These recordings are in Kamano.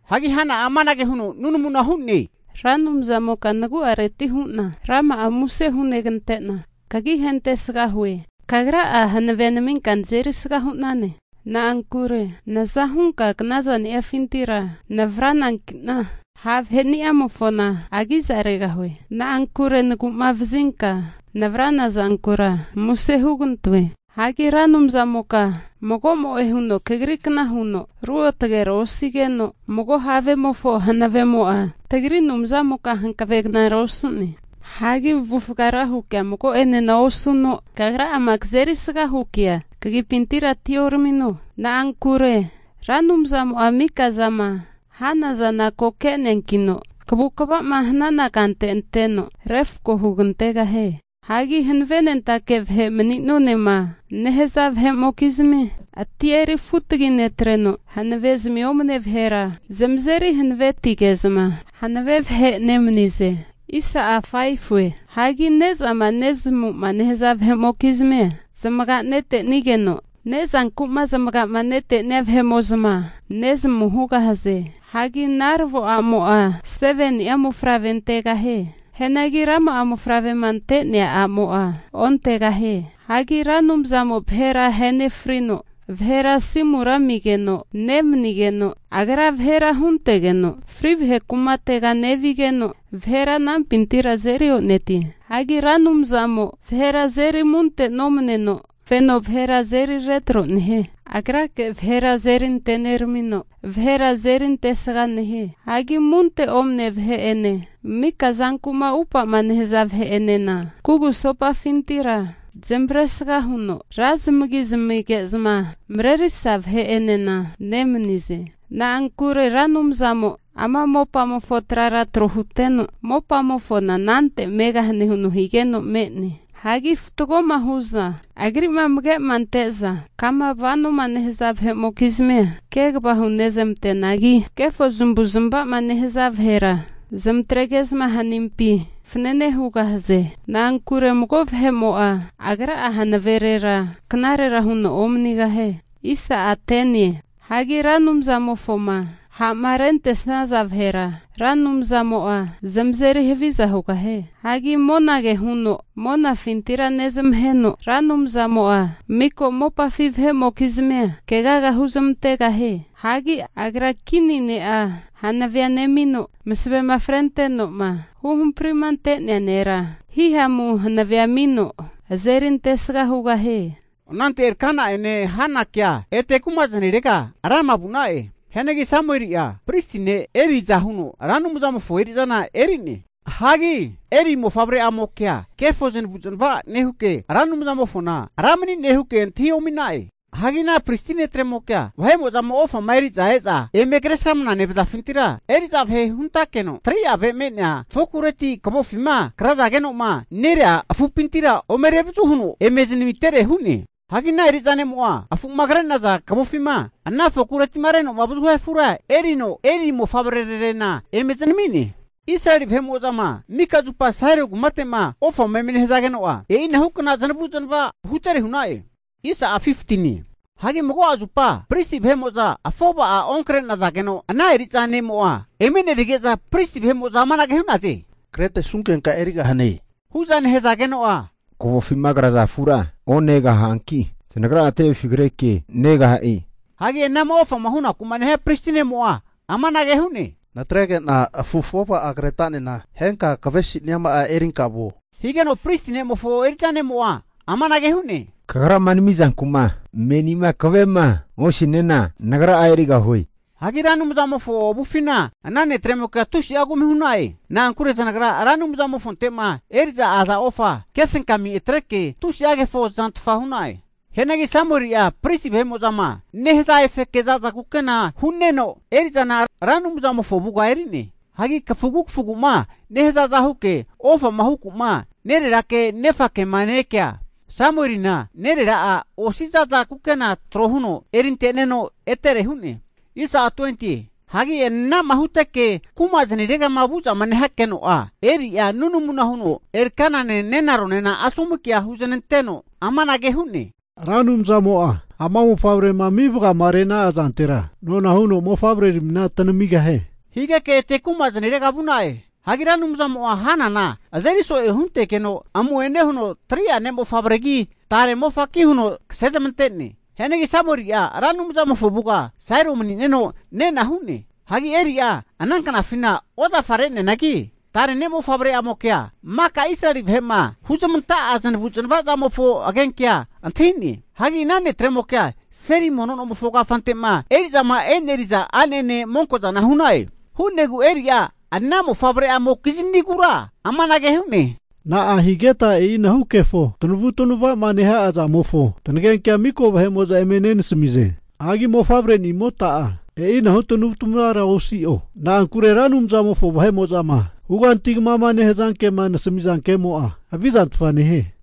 Hagi Hana'a amanage huno nunamuna hu'ne, Ra Anumzamoka nagu'areti hu'na rama'a muse hugante'na kagi ahentesga hue. Kagra'a hanavea naminka nazeri sga hu'nane. Na'ankure naza hunka knazaniafintira navrananki'na, ha' vaheni'amofona agizaregahue. Na'ankure nagu'mavazinka navrana zankura muse hugantoe. Hagi Ra Anumzamoka mago'mo'e huno kagri kna huno ruotagera osigeno, mago havemofo hanavemo'a tagri Anumzamoka hankavegnara osu'ne. Hagi avufga rahu kea mago'ane osuno, kagra'ama kazerisga hu kea kagipintira atioramino. Na'ankure Ra Anumzamo'a mika'zama hanana zana ko ke'neankino, kavukava'ma hanana kante anteno, refko hugantegahie. Hagi hanavenentake vahe mani'nonema nehaza vahe'mokizmi atia eri futagi netreno, hanavezmi omne vahera zamazeri hanavetige'zma hanave vahe nemanize. Hagi ne'zama nezamu'ma nehaza vahe'mokizmia, zamaga netenigeno, ne'zanku'ma zamaga'ma netenia vahe'mo'za nezamu hugahaze. Hagi naravo a'mo'a 7ni'a mofavre antegahie. Hianagi rama'a mofavrema ante'nea a'mo'a ontegahie. Hagi Ra Anumzamo vahera ahenefrino, vahera asimura amigeno nemanigeno, Agra vahera huntegeno fri vahe kumatega nevigeno, vahera anampintira azeri onetie. Hagi Ra Anumzamo vahera azeri amunte nomaneno, feno vahera azeri retro nehie. Agrake vahera azeri anteneramino, vahera azeri antesga nehie. Hagi amunte omane vahe'ene mika zanku'ma upa'ma nehaza vahe'enena kugusopafintira zamavaresga huno ra zamagi zamige'zma marerisa vahe'enena nemanize. Na'ankure Ra Anumzamo'a ama mopamofo trara tro huteno, mopamofona anante megahane huno higeno me'ne. Hagi fatgoma hu'zma Agri'ma amage'ma ante'za kama vanoma nehaza vahe'mokizmia kegava hunezamanteanagi, kefo zamavu'zmava'ma nehaza vahera zamatrege'za hanimpi fanene hugahaze. Na'ankure mago vahe'mo'a agra'a hanaverera knarera huno omanigahie. Hagi Ra Anumzamofoma ha'ma rentesnaza vahera, Ra Anumzamo'a zamazeri haviza hugahie. Hagi monage huno monafintira nezamaheno, Ra Anumzamo'a miko mopafi vahe'mokizmia kegaga huzamantegahie. Hagi Agra kini ne'a hanavea nemino, masavema frentenoma huhamprima ante'nea nera hihamu hanavea amino azeri antesga hugahie. Anante Elkana'ene Hanakea ete kumazanirega Rama vu'na'e. Hianagi Samueli'a pristi ne' Eli aza huno Ra Anumzamofo eri'zana eri'ne. Hagi Eli mofavre'amokea kefo zanavu'zanava nehuke, Ra Anumzamofona Ra mani'ne huke antahi omi'na'e. Hagi ana pristi ne'tremokea vahe'mo'zama ofama eri'za e'za eme kresramana nevazafintira, eri'za vahe huntakeno 3'a ave me'nea fokureti kavofima krazageno'ma nerea afupintira ome revazu huno eme zanamitere hu'ne. Hagi ana eri'za ne'mo'a afu'ma kre'naza kavofima ana fokureti'ma reno avazuma hia afura, erino Eli mofavrerarena eme zanami'ne. Israeli vahe'mo'zama mika zupa Sailo kumate'ma ofama eme nehazageno'a, e'inahukna zanavu'zanava hutere hu'na'e. Hagi mago'a zupa pristi vahe'mo'za afova'a onkre'nazageno ana eri'za ne'mo'a emenerige'za, pristi vahe'mo'za amanage hu'naze, kretesunkenka erigahane hu'zama nehazageno'a, kavofima kraza afura onegaha'anki zanagra'a tevefi kreke negaha'e. Hagi anama ofama hunaku'ma nehia pristi ne'mo'a amanage hu'ne, natrege'na afu afova'a kretanena, henka kavesiniama'a erinka vuo, higeno'a pristi ne'mofo eri'za ne'mo'a amanage hu'ne, kagrama namizanku'ma menima kave'ma osiniana, nagra'a erigahue. Hagi Ra Anumzamofo avufina ana netremokea tusi'a kumi hu'na'e. Na'ankure zanagra Ra Anumzamofonte'ma eri'za aza ofa kefenkami atreke tusi'a kefo zantfa hu'na'e. Hianagi Samueli'a pristi vahe'mo'zama nehaza efeke zaza kukena hu'neno, eri'zana Ra Anumzamofo avuga eri'ne. Hagi kafugu kafugu'ma nehazaza huke ofama huku'ma nererake nefake'ma ne-ekea, Samuelina nerera'a osi za'za kukena'a tro huno erinte'neno etere hu'ne. Hagi anama huteke kuma zaniregama vu'zama nehakeno'a, Eli'a nunamuna huno Elkanane nenaronena asomu kea huznanteno amanage hu'ne, Ra Anumzamo'a ama mofavrema ami vagamarena'a zantera, nona huno mofavreramina tanamigahie, higeke ete kumazanirega vu'na'e. Hagi Ra Anumzamo'a Hanana azeri so'e huntegeno amu'ene huno 3'a ne'mofavregi tare mofaki huno kasezmante'ne. Hianagi Samueli'a Ra Anumzamofo avuga Sailo manineno nena hu'ne. Hagi Eli'a ananknafina ozafa re'neanagi tare ne'mofavre'amokea maka Israeli vahe'ma huzamanta'a zanavu'zanava zamofo agenkea antahine. Hagi ana netremokea seli mono nomofo kafante'ma eri'zama eneri'za a'nene monko'za hu'na'e. Hu'negu Eli'a ana mofavre'amokiznigura amanage hu'ne, na'ahigeta e'inahu kefo tanavu'tanava'ma neha'a zamofo tanagenkea miko vahe'mo'za eme nenasamize? Hagi mofavrenimota'a e'inahu tanavu'tanavara osi'o. Na'ankure Ra Anumzamofo vahe'mo'zama huganti kamama nehaza kema nasamiza kemo'a havizantfa nehie.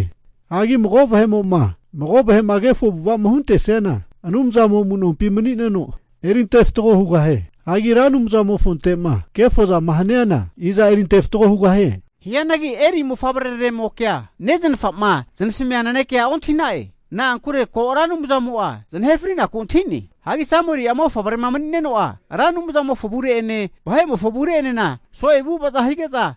Hagi mago vahe'mo'ma mago vahe'ma kefo avu'ava'ma huntesiana Anumzamo amu'nompina mani'neno eri ante fatgo hugahie. Hagi Ra Anumzamofonte'ma kefo zama haniana, i'za erinte fatgo hugahie? Hianagi Eli mofavreraremokea nezanafama zanasamia nanekea ontahi'na'e. Na'ankure ko' Ra Anumzamo'a zanahe fri'naku antahi'ne. Hagi Samueli'a mofavrema mani'neno'a Ra Anumzamofo avure'ene vahe'mofo avure'enena so'e avu'avaza hige'za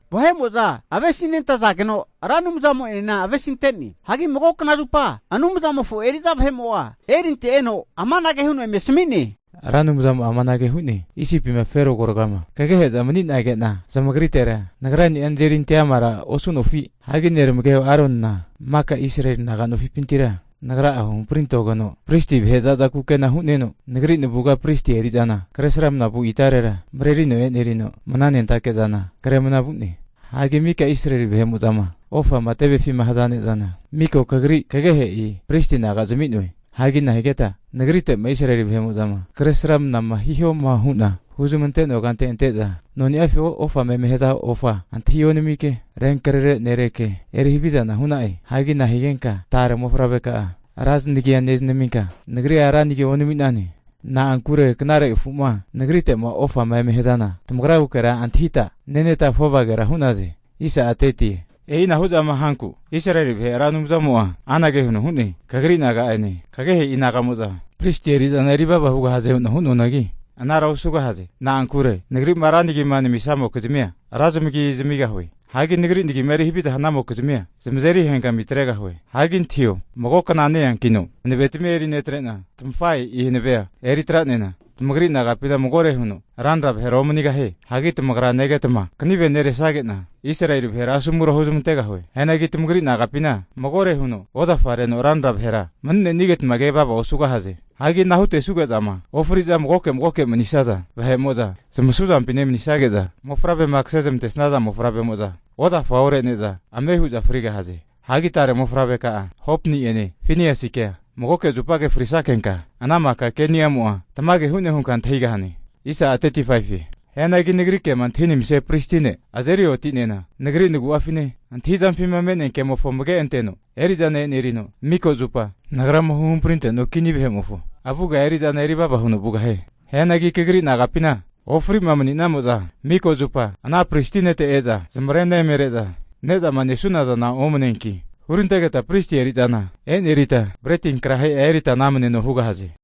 avesinentazageno Ra Anumzamo'enena avesinte'ne. Hagi mago knazupa Anumzamofo eri'za vahe'mo'a Elinte eno amanage huno eme asami'ne, Ra Anumzamo'a amanage hu'ne, Isipima Fero agoragama kagehe'zama mani'nage'na zamagritera Nagra'a nazeri ante amara osu'nofi? Hagi neramageho Aronina maka Israeli naga nofipintira Nagra'a huhampri antogeno pristi vahe zaza kukena hu'neno, Nagri navuga pristi eri'zana kresramna vu itarera marerino e'nerino, mananentake'zana kremna vu'ne. Hagi mika Israeli vahe'mo'zama ofama tevefima haza ne'zana, miko kagri kagehe'i pristi naga zami'noe. Hagi nahigeta Nagrite'ma Israeli vahe'mo'zama kresramnama hihoma hu'na huzmante'noa kante ante'za noniafima ofama eme haza ofa antahi onamike, renkrerera nereke eri havizana hu'na'e. Hagi nahigenka tare mofavreka'a ra zanagia nezanaminka, Nagria ra nagia onami'ne? Na'ankure knare afu'ma Nagrite'ma ofama eme hazana, tamagragukera antahita neneta afovagera hu'naze. E'inahu zama hanku Israeli vahe Ra Anumzamo'a anage huno hu'ne, Kagri naga'ene kagehe'i naga'mo'za pristi eri'zana erivava hugahaze hu'na hu'noanagi, anara osugahaze. Na'ankure Nagri'ma ra nagima namisamokizmia, ra zamagi zamigahue. Hagi Nagri nagima eri haviza hanamokizmia, zamazeri henkami atregahue. Hagi antahiho, mago kna ne-eankina hanavetamia erinetrena, tamafahe'i hanavea eritra'nena tamagri naga'pina magore huno ranra vahera omanigahie. Hagi tamagra negetma kanive neresage'na Israeli vahera asomura huzamantegahue. Hianagi tamagri naga'pina, magore huno ozafareno ranra vahera mani'nenageta ke vava osugahaze. Hagi ana hutesuge'zama ofri'zama magoke magoke'ma manisaza vahe'mo'za zamasuzampi nemanisage'za, mofavrema kasezamantesaza mofavremo'za, ozafa ore'ne'za ame hu'za frigahaze. Hagi tare mofavreka'a Hopni'ene Finiasikea magoke zupage frisakenka, ana maka ke'nimo'a tamage hu'ne hunka antahigahane. Hianagi nagri kema antahinamisia pristi ne' azeri oti'nena, Nagri nagu'afine antahizampima me'nea kemofo amage anteno eri'zana enerino, miko zupa Nagrama huhamprinte'nua kini vahe'mofo avuga eri'zana erivava huno vugahie. Hianagi kagri naga'pinti'ma ofri'ma mani'namo'za miko zupa ana pristi ne'te e'za zamare'na emere'za, ne'zama nesunazana omaneanki hurantegeta pristi eri'zana enerita, breti ankrahe'a erita namneno hugahaze.